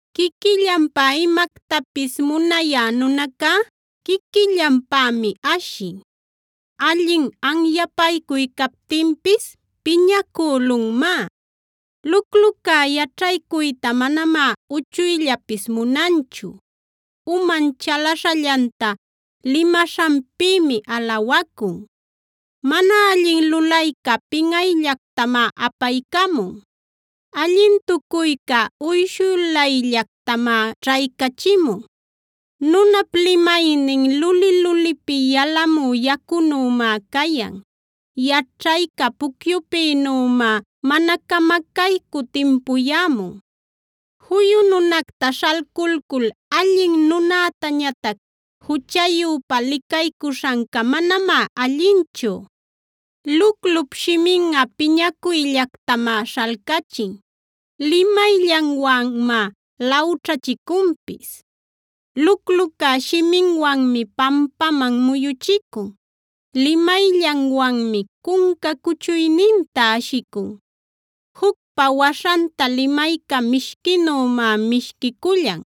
Quiquillanpä imactapis munayä nunacá quiquillanpämi ashin; allin anyapaycuy captinpis piñacülunmá. Luclucá yaćhaycuyta manamá uchuyllapis munanchu; uman chalaśhallanta limaśhanpïmi alawacun. Mana allin lulayca pinꞌayllactamá apaycamun; allintucuyca uyshulayllactamá ćhaycachimun. Nunap limaynin luli-lulipi yalamü yacunümá cayan; yaćhayca pucyupïnümá mana camacaycü timpuyämun. Juyu nunacta śhalculcul allin nunätañatac juchayüpa licaycuśhanca manamá allinchu. Luclup shiminꞌa piñanacuyllactamá śhalcachin; limayllanwanmá lawćhachicunpis. Lucluca shiminwanmi pampaman muyuchicun; limayllanwanmi cunca cuchuyninta ashicun. Jucpa waśhanta limayca mishquinümá mishquicullan;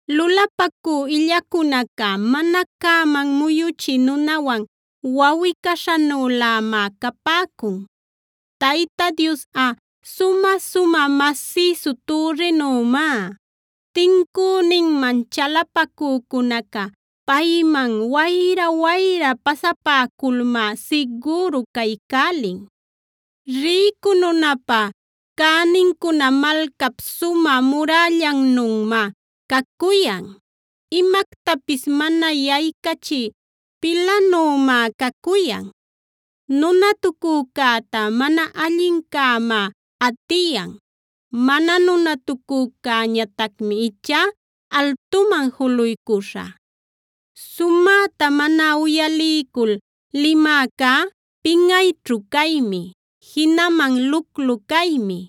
Lulapacü illacunaca mana cäman muyuchï nunawan wawꞌi-caśhanülämá capäcun. Tayta Diosꞌa sumä-sumä masïsu türrinümá; tincüninman chalapacücunaca payman wayra-wayra pasapäculmá sigüru caycälin. Rïcu nunapä cänincuna malcap sumä murällannümá cacuyan; imactapis mana yaycachï pilanümá cacuyan. Nunatucücäta mana allincämá atiyan; mana nunatucücäñatacmi ichá altuman juluycuśha. Sumäta mana uyaliycul limäcá pinꞌayćhu caymi, jinaman luclu caymi.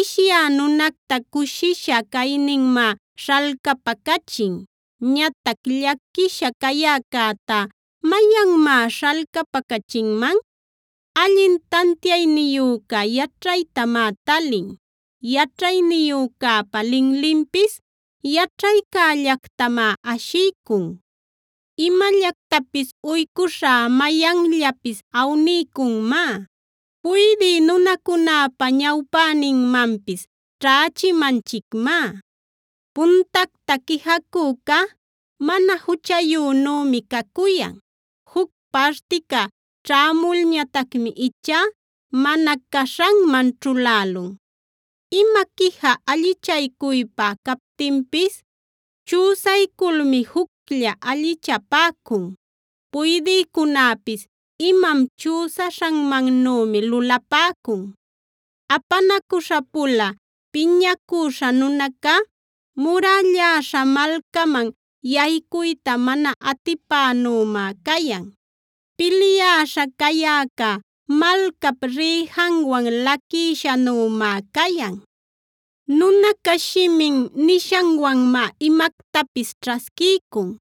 Ishyä nunacta cushisha cayninmá śhalcapacachin. Ñatac llaquisha cayäcätá, ¿mayanmá śhalcapacachinman? Allin tantiayniyüca yaćhaytamá talin; yaćhayniyücäpa linlinpis yaćhaycällactamá ashiycun. Imallactapis uycuśhá mayanllapis awniycunmá; puydï nunacunäpa ñawpäninmanpis ćhächimanchicmá. Puntacta quijacüca mana juchayünümi cacuyan; juc partica ćhämulñatacmi ichá mana caśhanman ćhulälun. Ima quija allichaycuypä captinpis chüsayculmi juclla allichapäcun; puydïcunäpis imam chüsaśhanmannümi lulapäcun. Apanacuśha-pula piñacüśha nunaca murälläśha malcaman yaycuyta mana atipananümá cayan; pilyäśha cayäca malcap rïjanwan laquïshanümá cayan. Nunaca shimin nishanwanmá imactapis ćhasquiycun;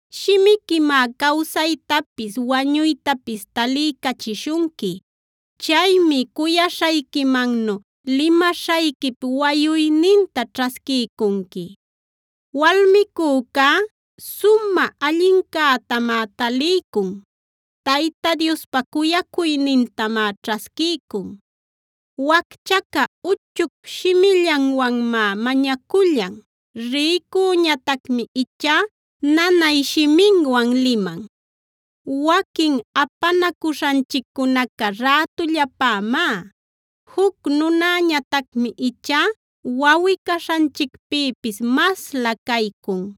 Shimiquimá cawsaytapis wañuytapis taliycachishunqui; chaymi cuyaśhayquimannu limaśhayquip wayuyninta ćhasquiycunqui. Walmicücá sumä allincätamá taliycun; Tayta Diospa cuyacuynintamá ćhasquiycun. Wacchaca uchuc shimillanwanmá mañacullan; rïcüñatacmi ichá nanay shiminwan liman. Waquin apanacuśhanchiccunaca rätullapämá; juc nunäñatacmi ichá wawꞌi-caśhanchicpïpis maslä caycun.